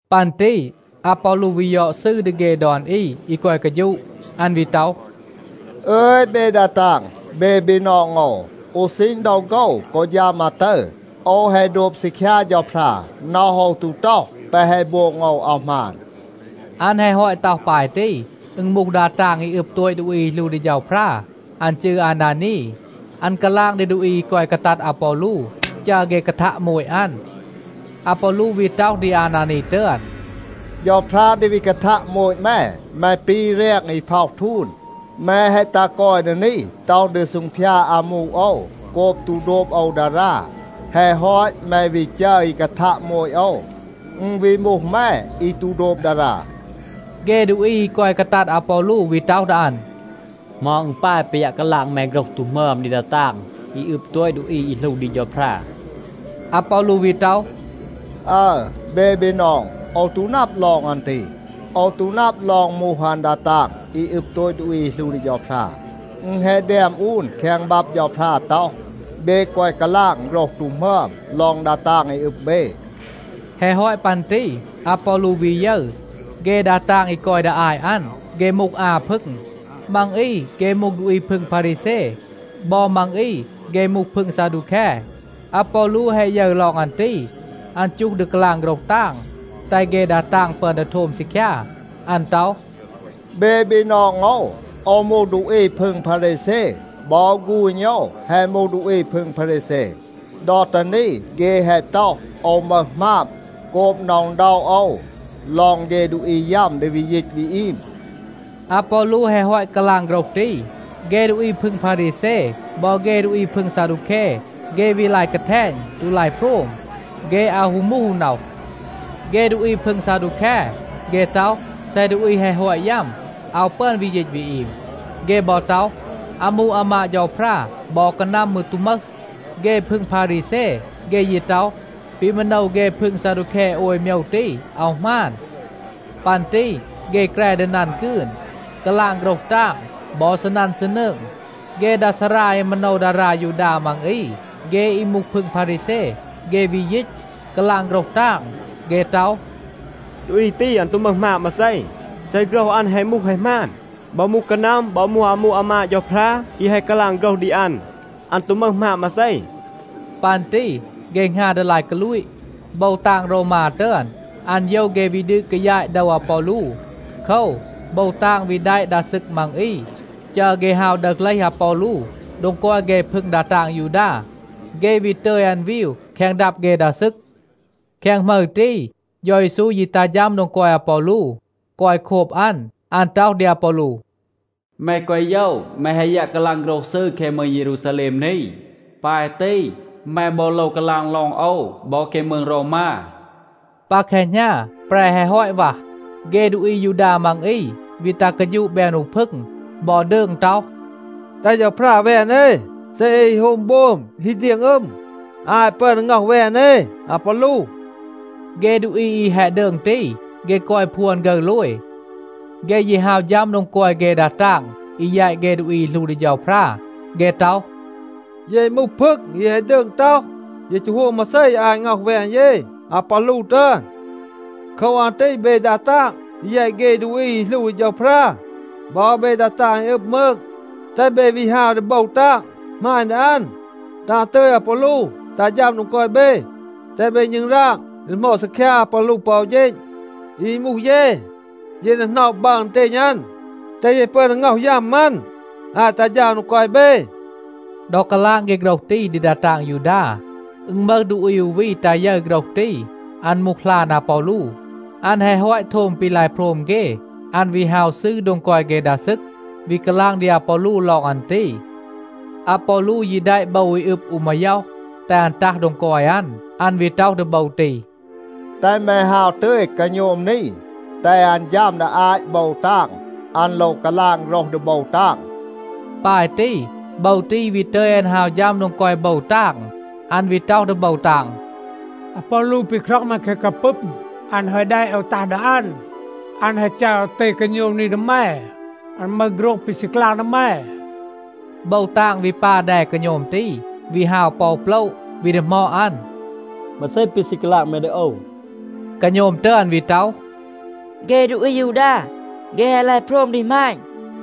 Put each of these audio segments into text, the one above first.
ปัน ตี อาปอลู วี ยอด ซืร ดี เฆ ดอน อี อี กอย กาฌูะ. อัน วี ต็อห “อึย เบ ดา ตาง, เบ บีนอง โอว. อู ซีณ ดอ โฆว กอ ฌัม อาตึร โอว แฮะ โดบ ซีคยา เฌาพรา. น็อห โอว ตู ต็อห, แปะ แฮะ โบง โอว อาว หมาน.” อัน แฮะ ฮอต ต็อห ปาย ตี, อึณ มูห ดา ตาง อี อึบ โตต ดูอี อี หลู ดี เฌาพรา. อัน จืร อานานี. อัน กาลาง ดี ดูอี อี กอย กาตัด อาปอลู, จัร เฆ กาทัะ โมต อัน. อาปอลู วี ต็อห ดี อานานี ตึอน, “เฌาพรา ดี วี กาทัะ โมต แม. แม ปี แรง อี พ็อห ทูน. แม แฮะ ตัห กอย ดี นี, ต็อห ดี ซูงพยาด อามู โอว โกบ ตู โดบ โอว ดารา. แฮะ ฮอต แม วี จัร อี กาทัะ โมต โอว. อึณ วี มูห แม อี ตู โดบ ดารา.” เฆ ดูอี อี กอย กาตัด อาปอลู วี ต็อห ดี อัน, “เหมา อึณ ปาย ปี ยัะ กาลาง แม โฆรห ตู หมึอม ดี ดา ตาง อี อึบ โตต ดูอี อี หลู ดี เฌาพรา?” อาปอลู วี ต็อห, “อึร เบ บีนอง, โอว ตู นับ ลอง อัน ตี. โอว ตู นับ ลอง มูห อัน ดา ตาง อี อึบ โตต ดูอี อี หลู ดี เฌาพรา. อึณ แฮะ แดม อูน แคง บับ เฌาพรา ต็อห, ‘เบ แกวะ กาลาง โฆรห ตู หมึอม ลอง ดา ตาง อี อึบ เบ.’” แฮะ ฮอต ปัน ตี อาปอลู วี ยึร, เฆ ดา ตาง อี กอย ดี อาต อัน, เฆ มูห อา พึง. มัง อี เฆ มูห ดูอี พึง พารีแซ. บอ มัง อี เฆ มูห พึง ซาดูแค. อาปอลู แฮะ ยึร ลอง อัน ตี, อัน จูห ดี กาลาง โฆรห ตาง, แตห เฆ ดา ตาง ปึอน ดี โทม ซีคยา. อัน ต็อห, “เบ บีนอง โอว, โอว มูห ดูอี พึง พารีแซ. บอ ฆูณ โอว แฮะ มูห ดูอี พึง พารีแซ. ดอ ตี นี เฆ แฮะ ต็อห, โอว มึห หมาบ โกบ หน็อะ อึณด็อะ โอว ลอง เฆ ดูอี ยัม ดี วี ยีต วี อีม.” อาปอลู แฮะ ฮอต กาลาง โฆรห ตี, เฆ ดูอี พึง พารีแซ บอ เฆ ดูอี พึง ซาดูแค, เฆ วี ลาย กาแทณ ตู ลาย โพรม. เฆ อาว ฮู มูห อู น็อห. เฆ ดูอี พึง ซาดูแค, เฆ ต็อห, เซ ดูอี แฮะ ฮอต ยัม, อาว ปึอน วี ยีต วี อีม. เฆ บอ ต็อห, อามู อามาด เฌาพรา บอ กานัม มืร ตู มึห. เฆ พึง พารีแซ, เฆ ยี ต็อห, ปี มาโนว เฆ พึง ซาดูแค โอย โมยว ตี อาว หมาน. ปัน ตี เฆ แกร ดี นัน กืน, กาลาง โฆรห ตาง, บอ ซีนัน ซีนืง. เฆ ดา ซารา อี มาโนว ดารา ยูดา มัง อี, เฆ อี มูห พึง พารีแซ, เฆ วี ยีต, กาลาง โฆรห ตาง. เฆ ต็อห, “ดูอี ตี, อัน ตู มึห หมาบ มาเซ. เซ โฆรห อัน แฮะ มูห แฮะ หมาน, บอ มูห กานัม, บอ มูห อามู อามาด เฌาพรา อี แฮะ กาลาง โฆรห ดี อัน, อัน ตู มึห หมาบ มาเซ.” ปัน ตี เฆ หงา ดี ลาย กาลูต. โบว ตาง โรวมา ตึอน, อัน โยว เฆ วี ดืด กายาต โดว อาปอลู. โคว, โบว ตาง วี แดะ ดา ซึก มัง อี, จัร เฆ ฮาว ดึห เลห อาปอลู โดง กอย เฆ พึง ดา ตาง ยูดา. เฆ วี ตึย อัน วีว แคง ดับ เฆ ดา ซึก. แคง หมึร ตี, เฌา เยซู ยี ตัห ฌัม โดง กอย อาปอลู, กอย โคบ อัน. อัน ต็อห ดี อาปอลู, “แม แกวะ โยว. แม แฮะ ยัะ กาลาง โฆรห ซืร แคง มืง เยรูซาแลม นี. ปาย ตี, แม บอ โลว กาลาง ลอง โอว บอ แคง มืง โรวมา.” ปา แคหณา, แปร แฮะ ฮอต วัห, เฆ ดูอี อายูดา มัง อี วี ตัห กาฌูะ แบน อู พึง บอ ดืง ต็อห, “แตห เฌาพรา แวน เอ, เซ เอ ฮี โฮม โบม, ฮี เดียง อึม อาต ปึอน ดี ง็อห แวน เอ อาปอลู.” เฆ ดูอี อี แฮะ ดืง ตี, เฆ กอย พวน ฆึร โลย. เฆ ยี ฮาว ฌัม โดง กอย เฆ ดา ตาง อี แยต เฆ ดูอี อี หลู ดี เฌาพรา. เฆ ต็อห, “เย มูห พึง อี แฮะ ดืง ต็อห, เย ตู โฮม มาเซ อาต ง็อห แวน เย อาปอลู ตึอน. โคว อัน ตี เบ ดา ตาง อี แยต เฆ ดูอี อี หลู ดี เฌาพรา บอ เบ ดา ตาง อี อึบ มืง, แตห เบ วี ฮาว ดี โบว ตาง, หมาณ ดี อัน, แตห อัน ตึย อาปอลู ตัห ฌัม โดง กอย เบ. แตห เบ ณึงราง ดี ดีหมอด ซีคยา อาปอลู ปอ อู เฌณ. อี มูห เย, เย ดี หน็อะ บัร อึณเตณ อัน, แตห เย ปึอน ดี ง็อห ยัม อัน อาต ตัห ฌัม อัน โดง กอย เบ.” ดอ กาลาง เฆ โฆรห ตี ดี ดา ตาง ยูดา, อึณ มึห ดูอี อู วี ตา ยึร โฆรห ตี. อัน มูห หลาน อาปอลู. อัน แฮะ ฮอต โทม ปี ลาย โพรม เฆ, อัน วี ฮาว ซืร โดง กอย เฆ ดา ซึก, วี กาลาง ดี อาปอลู ลอง อัน ตี. อาปอลู ยี แดะ โบว อี อึบ อู มาย็อห, แตห อัน ตัห โดง กอย อัน. อัน วี ต็อห ดี โบว ตี, “แตห แม ฮาว ตึย กาโณม นี, แตห อัน ฌัม ดี อาต โบว ตาง. อัน โลว กาลาง โฆรห ดี โบว ตาง.” ปาย ตี, โบว ตี วี ตึย อัน ฮาว ฌัม โดง กอย โบว ตาง. อัน วี ต็อห ดี โบว ตาง, “อาปอลู ปี คร็อง แม แคง กาปึม, อัน แฮะ แดะ โอว ตัห ดี อัน. อัน แฮะ จัร โอว ตึย กาโณม นี ดี แม. อัน มึห โฆรห ปี ซี กาลาง ดี แม.” โบว ตาง วี ปา แด กาโณม ตี, วี ฮาว ปอ อู โปละ, วี ดีหมอด อัน, “มาเซ ปี ซี กาลาง แม ดี โอว?” กาโณม ตึอน วี ต็อห, “เฆ ดูอี อายูดา, เฆ แฮะ ลาย โพรม ดี หมาณ,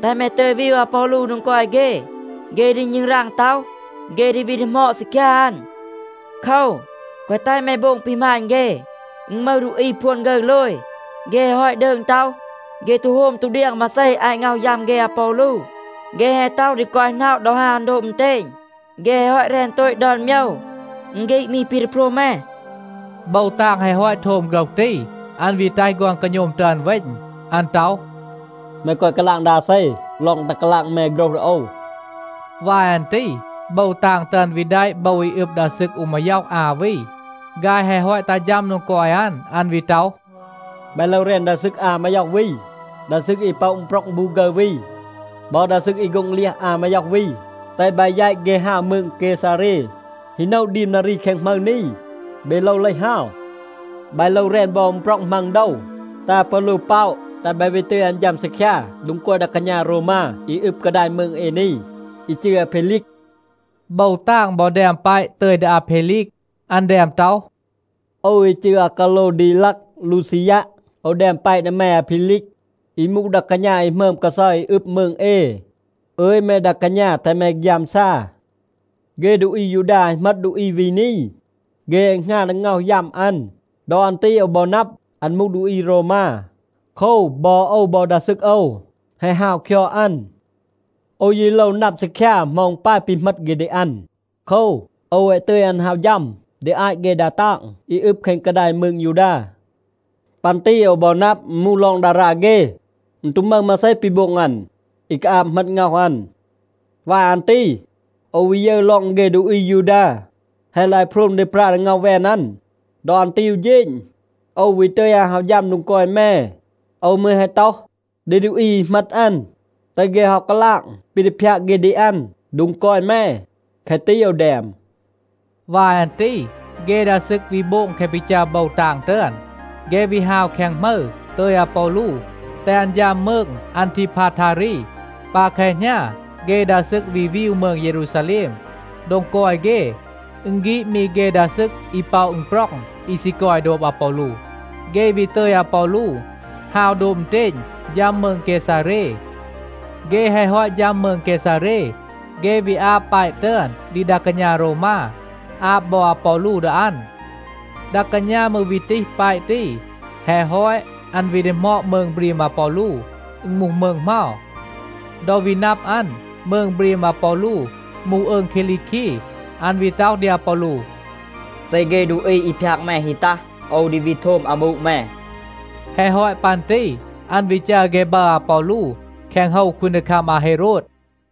แตห แม ตึย วีว อาปอลู โดง กอย เฆ. เฆ ดี ณึงราง ต็อห, เฆ ดี วี ดีหมอด ซีคยา อัน. โคว, แกวะ แตห แม โบง ปี หมาณ เฆ. อึณ มึห ดูอี พวน ฆึร โลย. เฆ แฮะ ฮอต ดืง ต็อห, เฆ ตู โฮม ตู เดียง มาเซ อาต ง็อห ยัม เฆ อาปอลู. เฆ แฮะ ต็อห ดี กอย หน็อะ ดอ ฮาว อัน โดบ อึณเตณ. เฆ แฮะ ฮอต แรน โตต ดอน โมยว. อึณ ฆีด มี ปี ดี โพรม แม.” โบว ตาง แฮะ ฮอต โทม โฆรห ตี, อัน วี แตห ฆอน กาโณม ตึอน เวณ. อัน ต็อห, “แม แกวะ กาลาง ดี อาเซ ลอง ตัห กาลาง แม โฆรห ดี โอว.” วาย อัน ตี โบว ตาง ตึอน วี แดะ โบว อี อึบ ดา ซึก อู มาย็อห อา วี. ฆาย แฮะ ฮอต ตัห ฌัม โดง กอย อัน, อัน วี ต็อห, “บาย โลว แรน ดา ซึก อา มาย็อห วี, ดา ซึก อี ป็อะ อึณปร็อง บู ฆึร วี บอ ดา ซึก อี โฆ็ง เลียห อา มาย็อห วี, แตห บาย แยต เฆ ฮาว มืง เกซาเร. ฮี โนะ ดีม นารี แคง หมึร นี, เบ โลว เลห ฮาว. บาย โลว แรน บอ อึณปร็อง มัง โดว แตห อาปอลู ป็อะ, แตห บาย วี ตึย อัน ฌัม ซีคยา โดง กอย ดา กาณา โรวมา อี อึบ กาดาย มืง เอ นี, อี จืร อาเพลีก.” โบว ตาง บอ แดม แปะ ตึย ดี อาเพลีก. อัน แดม ต็อห, “โอว อี จืร อากาโลวดีลัก ลูซียัะ, โอว แดม แปะ ดี แม อาเพลีก, อี มูห ดา กาณา อี หมึอม กาเซา อี อึบ มืง เอ. อึย, แม ดา กาณา, แตห แม ฆยามซา. เฆ ดูอี อายูดา แฮะ เหมต ดูอี วี นี. เฆ แฮะ หงา ดี ง็อห ยัม อัน. ดอ อัน ตี โอว บอ นับ, อัน มูห ดูอี โรวมา. โคว, บอ โอว บอ ดา ซึก โอว แฮะ ฮาว คยอด อัน. โอว ยี โลว นับ ซีคยา เหมา อึณ ปาย ปี เหมต เฆ ดี อัน. โคว, โอว แฮะ ตึย อัน ฮาว ฌัม ดี อาต เฆ ดา ตาง อี อึบ แคง กาดาย มืง ยูดา. ปัน ตี โอว บอ นับ, อึณ มูห ลอง ดารา เฆ. อึณ ตู มึห มาเซ ปี โบง อัน, อี กาอาบ เหมต ง็อห อัน. วาย อัน ตี โอว วี ยึร ลอง เฆ ดูอี อายูดา แฮะ ลาย โพรม ดี ปรา ดี ง็อห แวน อัน. ดอ อัน ตี อู เฌณ, โอว วี ตึย อัน ฮาว ฌัม โดง กอย แม. โอว มืร แฮะ ต็อห ดี ดูอี อี เหมต อัน, แตห เฆ ฮาว กาลาง ปี ดี พยาก เฆ ดี อัน โดง กอย แม. แคะ ตี โอว แดม.” วาย อัน ตี เฆ ดา ซึก วี โบง แคะ ปี จัร โบว ตาง ตึอน. เฆ วี ฮาว แคง หมึร, ตึย อาปอลู, แตห อัน ฌัม มืง อันทีพาทารี. ปา แคหณา เฆ ดา ซึก วี วีว มืง เยรูซาแลม, โดง กอย เฆ. อึณ ฆีด มี เฆ ดา ซึก อี ป็อะ อึณปร็อง อี ซี กอย โดบ อาปอลู. เฆ วี ตึย อาปอลู ฮาว โดบ อึณเตณ ฌัม มืง เกซาเร. เฆ แฮะ ฮอต ฌัม มืง เกซาเร, เฆ วี อาบ แปะ ตึอน ดี ดา กาณา โรวมา, อาบ บอ อาปอลู ดี อัน. ดา กาณา มืร วี ตีห แปะ ตี. แฮะ ฮอต, อัน วี ดีหมอด มืง บรีม อาปอลู, อึณ มูห มืง เหมา. ดอ วี นับ อัน, มืง บรีม อาปอลู มูห อืง คีลีคี, อัน วี ต็อห ดี อาปอลู, “เซ เฆ ดูอี พยาก แม ฮี ตัห, โอว ดี วี โทม อามู แม.” แฮะ ฮอต ปัน ตี อัน วี จัร เฆ บัร อาปอลู แคง โฮว คูนดีคัม อาเฮโรด.